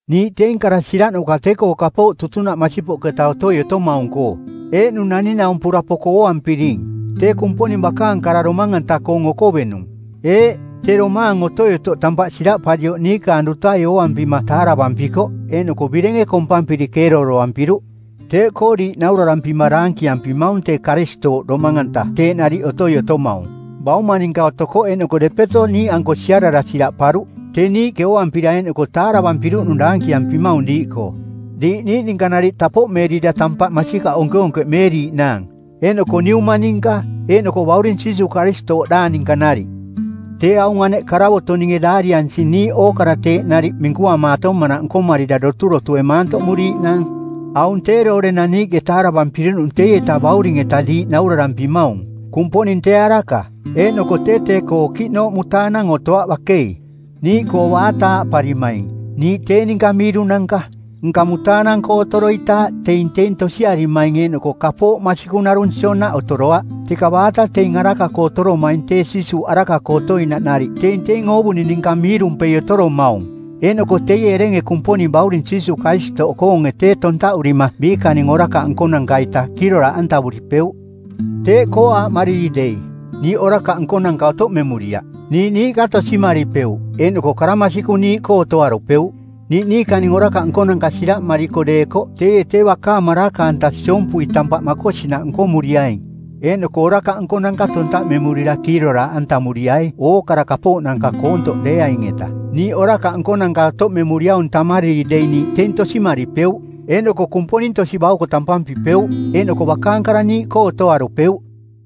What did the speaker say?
Niiꞌ teing kara siraꞌnuka tee-koo kapooꞌ tutunaꞌ masipoꞌketa otoi otomaung-koo, eeꞌnung naning-naumpura poko ooampiring, tee Kumponing Bakaang Kara Domang-anta-koong Okovenung. Eeꞌ, tee Domaang Otoi-otoꞌ tampaꞌ siraꞌparioꞌ niikaang dutai ooampima taaravampikoꞌ, eeꞌnoko birenge kompampiri keerooroampiruꞌ. Teeꞌkoo diiꞌ naurarampima daankiampimaung tee Karistooꞌ Domang-anta teeꞌ nariꞌ otoi otomaung. Bauma ninka otokoꞌ eeꞌnoko depeto niiꞌanko siarara siraꞌparuꞌ. Tee niiꞌke ooampira eeꞌnoko taaravampiruꞌnung daankiampimaung diiꞌkoo, diiꞌ niiꞌ ninka nariꞌ tapoꞌmeerira tampaꞌ masikaꞌ onkeonkeꞌmeeriiꞌnaang, eeꞌnoko Niuma ninka eeꞌnoko Bauring Jiisuuꞌ Karistooꞌdaang ninka nariꞌ. Tee aung aneꞌ karavoto˜ ninge daariansing niiꞌ ookara teeꞌ nariꞌ minkuamaatomanaꞌ nkomarira doturotue maantoꞌmuriiꞌnaang. Aung tee doorenang niiꞌke taaravampiruꞌnung teieta Bauring-eta diiꞌ naurarampimaung: Kumponing tee araka eeꞌnoko tee tee-koo okiꞌnooꞌ mutaanang otoaꞌ bakei. Niiꞌkoo baata aaꞌparimaing, “Niiꞌ tee ninka miirunanka,” nka mutaanang-koo otoroitaaꞌ teing teing tosiarimaing eeꞌnoko kapooꞌ masikung narung sionaꞌ otoroaꞌ. Teka baata teing araka-koo otoromaing tee Jiisuuꞌ araka-koo otoinaꞌ nariꞌ teing teing oovuning ninka miirumpei otoromaung, eeꞌnoko teie erenge Kumponing Bauring Jiisuuꞌ Karistooꞌkoonge tee tontaꞌurima biikaning orakaꞌ nkonanka-ita kiiroraaꞌantavuripeuꞌ. Teeꞌkoo aaꞌmariri dei, “Niiꞌ orakaꞌ nkonanka otoꞌmemuriaꞌ,” niiꞌ niiꞌka tosimaripeuꞌ eeꞌnoko kara masikung niiꞌkoo otoarupeuꞌ. Niiꞌ niikaning orakaꞌ nkonanka siraꞌmariko deekoꞌ teie tee bakaang maraka-anta siompui tampaꞌ makosinaꞌ nkomuriaing eeꞌnoko orakaꞌ nkonanka tontaꞌmemurira kiiroraaꞌantamuriai ookara kapooꞌnanka koontoꞌ deeaing-eta. Niiꞌ orakaꞌ nkonanka otoꞌmemuriaung tammariri dei niiꞌ teing tosimaripeuꞌ eeꞌnoko Kumponing tosi-bauko tampampipeuꞌ, eeꞌnoko bakaang kara niiꞌkoo otoarupeuꞌ.